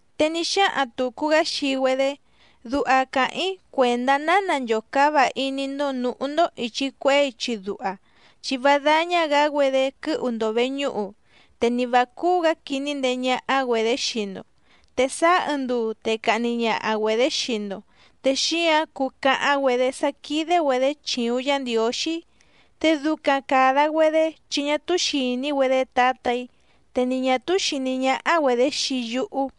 Te ní xáhaⁿ tùcu‑gá xii‑güedé: —Duha càháⁿ‑í cuèndá ná nanchòcáva iní‑ndó nǔhú‑ndó ìchi cuehé ichi duha. Chi vá dáñá‑gǎ‑güedé quɨ́hu‑ndo vèñúhu, te ni vǎ cúú‑gǎ quiní ndeé ñáhá‑güedě xii‑ndo. Te sáá ɨɨⁿ nduu te cahni ñaha‑güedě xii‑ndo, te xíǎⁿ cuu cahaⁿ‑güedě sá quídé‑güedě chìuⁿ Yá Ndiǒxí. Te ducaⁿ càda‑güedé chi ñá túú xìní‑güedé Tǎtà‑í, te ni ñà túú xìní ñáhá‑güedě xii yúhú.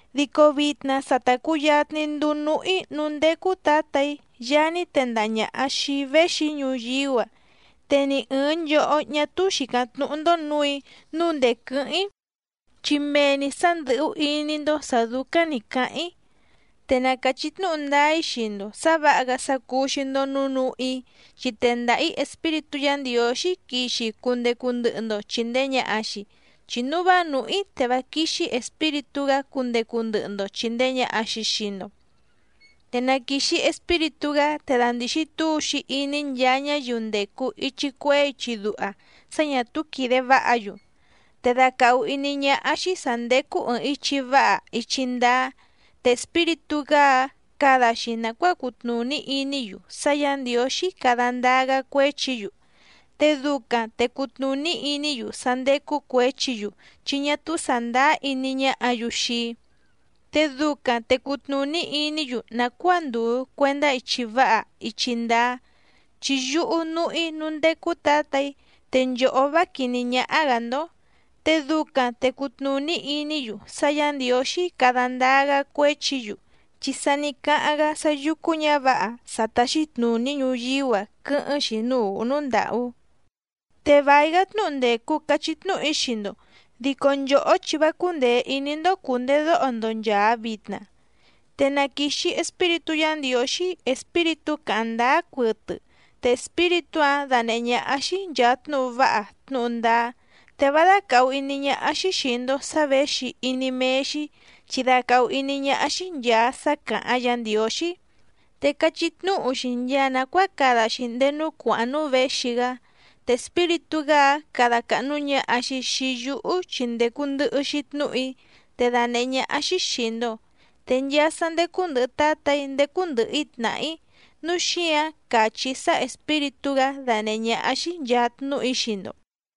Dico vitna sa ta cùyatni nduu núhú‑í núú ndécú Tǎtà‑í Yaá ní tendaha ñàha xii‑í véxi‑í ñuyíú‑a. Te ni ɨ̀ɨⁿ nchohó ñá túú xìcáⁿ tnúhú‑ndó nǔù‑í nǔu ndèé quɨ́hɨ́ⁿ‑í. Chi mee‑ni sǎ ndɨ̀hú iní‑ndó sǎ dúcáⁿ nǐ cáháⁿ‑í. Te na càchí tnúhu ndáá‑í xii‑ndo sǎ vǎha‑gá sá cúú‑xí‑ndó nǔu núhú‑í, chi tendaha‑ǐ Espíritú Yǎ Ndiǒxí quixi cundecu ndɨhɨ‑ndo chìndee ñaha‑xi, chi núu vá nùhú‑í te vá quíxí Espíritú‑gá cundecu ndɨhɨ‑ndo chìndee ñaha‑xi xii‑ndo. Te na quìxi Espíritú‑gá te dandìxi túu‑xi iní nchaa ñáyiu ndècu ichi cuehé ichi duha sá ñà túú quìde váha‑yu. Te dacàhu iní ñáhá‑xí sǎ ndécú ɨ̀ɨⁿ ichi váha ichi ndáá. Te Espíritú‑gá‑áⁿ cada‑xi nàcuáa cutnùní iní‑yu sá Yǎ Ndiǒxí cada ndáá‑gá cuéchi‑yu. Te ducaⁿ te cutnùní iní‑yu sá ndécú cuěchi‑yu, chi ñá túú sàndáá iní ñáhǎ‑yu xii‑í. Te ducaⁿ te cutnùní iní‑yu nàcuáa ndùu cuendá ichi váha ichi ndáá, chi yúhú núhú‑í núú ndécú Tǎtà‑í, te nchòhó vá quìní ñáhá‑gǎ‑ndó. Te ducaⁿ te cutnùní iní‑yu sá Yǎ Ndiǒxí cada ndáá‑gá cuéchi‑yu, chi sa ní cáháⁿ‑gá sá yúcú ñǎvǎha sá táxí tnùní ñuyíú‑a quɨ́hɨ́ⁿ‑xi núú ùhú núú ndàhú. ’Te vài‑gá tnúhu ndècu cachí tnúhu‑í xii‑ndo, dico nchòhó chi vá cúndèe iní‑ndó cùndedóho‑ndo nchàa vitna. Te na quìxi Espíritú Yǎ Ndiǒxí, Espíritú càháⁿ ndáá cuɨtɨ, te Espíritú‑áⁿ danèhé ñáhá‑xí nchàa tnúhu váha tnúhu ndáá. Te vá dácàhu iní ñáhá‑xí xìi‑ndo sá věxi iní méé‑xí chi dacàhu iní ñáhá‑xí nchàa sá càháⁿ Yǎ Ndiǒxí, te cachí tnúhu‑xi nchaa nàcuáa cada‑xi ndéé núú cuàháⁿ núú věxi‑gá. Te Espíritú‑gá‑áⁿ cada càhnu ñaha‑xi xii yúhú chi ndècu ndɨhɨ‑xi tnúhu‑í, te danèhé ñáhá‑xí xìi‑ndo. Te nchaa sá ndécú ndɨ̀hɨ Tátà‑í ndécú ndɨ̀hɨ‑í tnàhá‑í, núu xíǎⁿ càchí‑í sá Espíritú‑gá danèhé ñáhá‑xí nchàa tnúhu‑í xii‑ndo.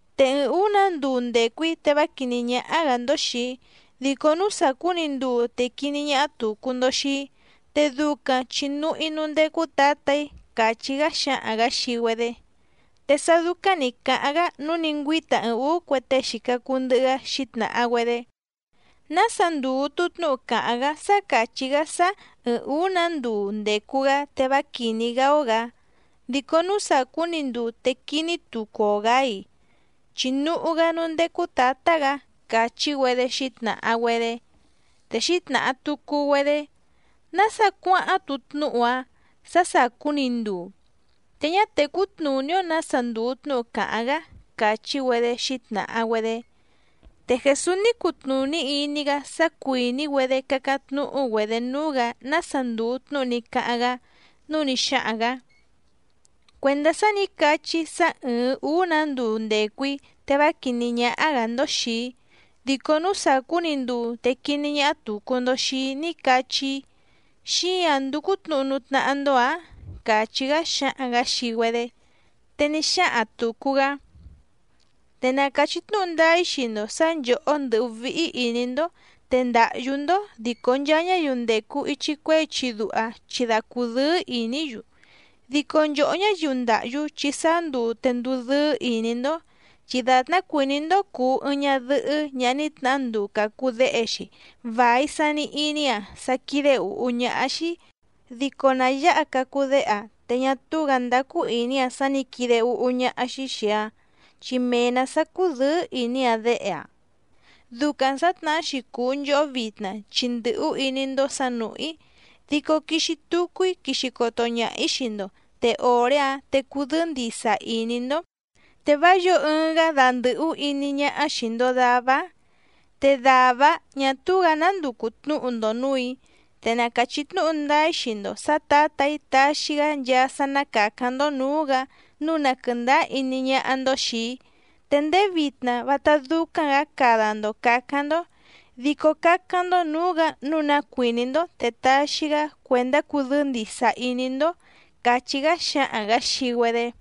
’Te ɨɨⁿ ǔú‑nǎ nduu ndècu‑í te vá quìní ñáhá‑gǎ‑ndó xìi‑í, dico núú sàcú‑ni nduu te quiní ñáhá tùcu‑ndo xii‑í, te ducaⁿ chi núhú‑í núú ndécú Tǎtà‑í —càchí‑gá xáhaⁿ‑gǎ xii‑güedé. Te sá dúcáⁿ nǐ cáháⁿ‑gá nǔu ní ngüíta ɨɨⁿ ǔú cue tée xìca cuu ndɨhɨ‑gá xǐtnàha‑güedé: —¿Nása ndùu‑tu tnúhu càháⁿ‑gá sá càchí‑gá sá ɨ̀ɨⁿ úú‑nǎ nduu ndècu‑gá te vá quìní‑gá‑ó‑gǎ, dico núú sàcú‑ni nduu te quiní tucu‑o‑gǎ‑i?, chi núhú‑gá núú ndécú Tǎtá‑gǎ —càchí‑güedé xǐtnàha‑güedé. Te xǐtnàha tucu‑güedé: —¿Nása cuáháⁿ‑tu tnúhu‑ǎⁿ sá sàcú‑ni nduu? Te ñá tècú tnùní‑ó nǎsa ndùu tnúhu càháⁿ‑gá —càchí‑güedé xǐtnàha‑güedé. Te Jèsús ní cutnùní iní‑gá sá cuìní‑güedé cácáⁿ tnúhú‑güedě núú‑gǎ nása ndùu tnúhu ní cáháⁿ‑gá, núu ní xáhaⁿ‑gǎ: —Cuèndá sá nǐ cachí‑í sá ɨ̀ɨⁿ úú‑nǎ nduu ndècu‑í te vá quìní ñáhá‑gǎ‑ndó xìi‑í, dico núú sàcú‑ni nduu te quiní ñáhá tùcu‑ndo xii‑í ní cachí‑í, ¿xíǎⁿ ndúcú tnǔhu núú tnáhá‑ndó‑ǎⁿ? —càchí‑gá xáhaⁿ‑gǎ xii‑güedé. Te ní xáhaⁿ tùcu‑gá: —Te na càchí tnúhu ndáá‑í xii‑ndo sǎ nchòhó ndɨ́hú víhí ìní‑ndó te ndáhyú‑ndó, dico nchaa ñáyiu ndècu ichi cuehé ichi duha chi da cudɨ́ɨ́ ìní‑yu. Dico nchòhó ñáyiu ndáhyú chi sáá nduu te nduu dɨ́ɨ́ ìní‑ndó. Chi dàtná cuìní‑ndó cùu ɨɨⁿ ñadɨhɨ́ ñaha ní tnahá nduu cacu déhe‑xi vài sani iní‑aⁿ sá quídé ǔhú ñáhá‑xí. Dico na yǎha cacu déhe‑aⁿ, te ñá túú‑gǎ ndácú ìní‑aⁿ sá nǐ quide úhú ñáhá‑xí xìi‑aⁿ chi mee‑nǎ sá cúdɨ̌ɨ́ ìní‑aⁿ déhe‑aⁿ. Ducaⁿ sǎtnahá‑xi cùu nchohó vitna chi ndɨ̀hú iní‑ndó sǎ nùhú‑í, dico quixi tucu‑í quixi coto ñaha‑ǐ xii‑ndo, te òré‑áⁿ te cudɨ́ɨ́ ndìsa iní‑ndó, te vá yǒo ɨɨⁿ‑gá dandɨ̀hú iní ñáhá xìi‑ndo davá‑áⁿ. ’Te dàvá‑áⁿ ñà túú‑gǎ ná nducu tnǔhu‑ndo nǔù‑í. Te na càchí tnúhu ndáá‑í xii‑ndo sǎ Tǎtà‑í taxi‑gá nchaa sá ná càcáⁿ‑ndó nǔú‑gǎ nǔu na quɨ̀ndáá iní ñáhá‑ndó xìi‑í. Te ndéé vitna vátá dúcáⁿ‑gǎ cada‑ndo càcáⁿ‑ndó. Dico cácáⁿ‑ndó nǔú‑gǎ nǔu ná cuìní‑ndó te taxi‑gá cuèndá cudɨ́ɨ́ ndìsa iní‑ndó —càchí‑gá xáhaⁿ‑gǎ xii‑güedé.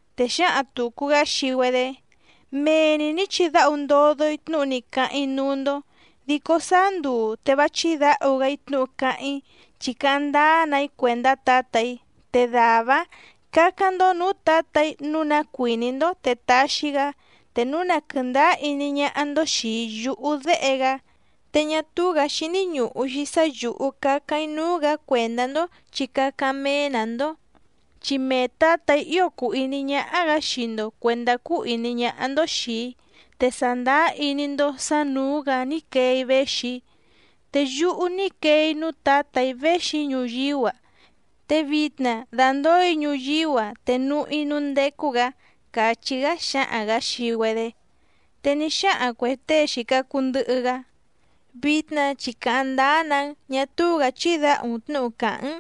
Te xǎhaⁿ tùcu‑gá xii‑güedé: —Mee‑ni nǐ chidáhu ndodo‑í tnúhu ní cáháⁿ‑í núú‑ndó, dico sáá nduu te vá chídǎhu‑gá‑í tnúhu cáháⁿ‑í, chi cáháⁿ ndáá‑na‑í cuèndá Tǎtà‑í. Te dàvá‑áⁿ cǎcáⁿ‑ndó nǔú Tǎtà‑í nǔu ná cuìní‑ndó te taxi‑gá, te núu na quɨ̀ndáá iní ñáhá‑ndó xìi yúhú Déhe‑gá. Te ñá túú‑gǎ xíní ñùhu‑xi sá yǔhú cácáⁿ‑í núú‑gǎ cuèndá‑ndó chi cácáⁿ méé‑nǎ‑ndó. Chi mee Tǎtà‑í ío cùu iní ñáhá‑gǎ xii‑ndo cuèndá cúú ìní ñáhá‑ndó xìi‑í, te sàndáá iní‑ndó sǎ nǔú‑gǎ ní quee‑í véxi‑í. Te yúhú ní quee‑í núú Tǎtà‑í véxi‑í ñuyíú‑a, te vitna dàndóo‑í ñuyíú‑a te núhú‑í núú ndécú‑gǎ —càchí‑gá xáhaⁿ‑gǎ xii‑güedé. Te ní xáhaⁿ cuè tée xìca cuu ndɨhɨ‑gá: —Vitna chi càháⁿ ndáá‑nǎ‑n, ñá túú‑gǎ chídǎhu‑n tnǔhu càhá‑n.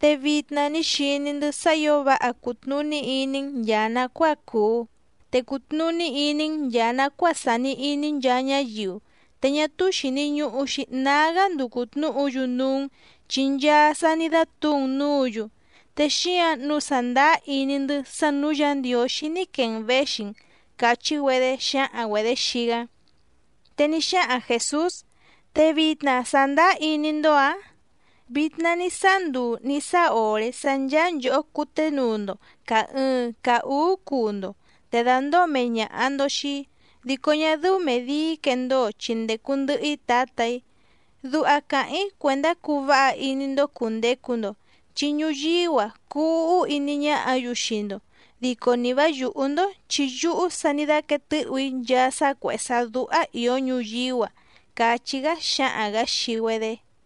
Te vitna ní xiní‑ndɨ́ sá ǐo váha cùtnuní iní‑n nchàa nacuáa cùu, te cùtnuní iní‑n nchàa nacuáa sàni iní nchaa ñáyiu. Te ñá túú xìni ñuhu‑xi nágá nducu tnǔhu‑yu núú‑n chi nchaa sa ní dátǔu‑n nǔǔ‑yu. Te xíǎⁿ nǔu sàndáá iní‑ndɨ́ sá nǔú Yǎ Ndiǒxí ní quee‑n věxi‑n —càchí‑güedé xǎhaⁿ‑güedě xii‑gá. Te ní xáhaⁿ Jèsús: —¿Te vitna sàndáá iní‑ndó‑ǎⁿ? Vitna ní sáá nduu nǐ sáá òré sá ncháá nchòhó cuténuu‑ndo càa ɨɨⁿ caa úú cuu‑ndo, te dàndóo mee ñàha‑ndo xii‑í. Dico ñá dɨ́ú mèe dii‑í quendóo chi ndècu ndɨhɨ‑í Tǎtà‑í. Duha càháⁿ‑í cuèndá cuu váha iní‑ndó cùndecu‑ndo, chi ñuyíú‑a cuu úhú iní ñáhǎ‑yu xii‑ndo, dico ni vǎ yùhú‑ndó chi yúhú sa ní dáquéé tɨ̌hù‑í nchaa sá cuèhé sá dúhá ìó ñuyíú‑a —càchí‑gá xáhaⁿ‑gǎ xii‑güedé.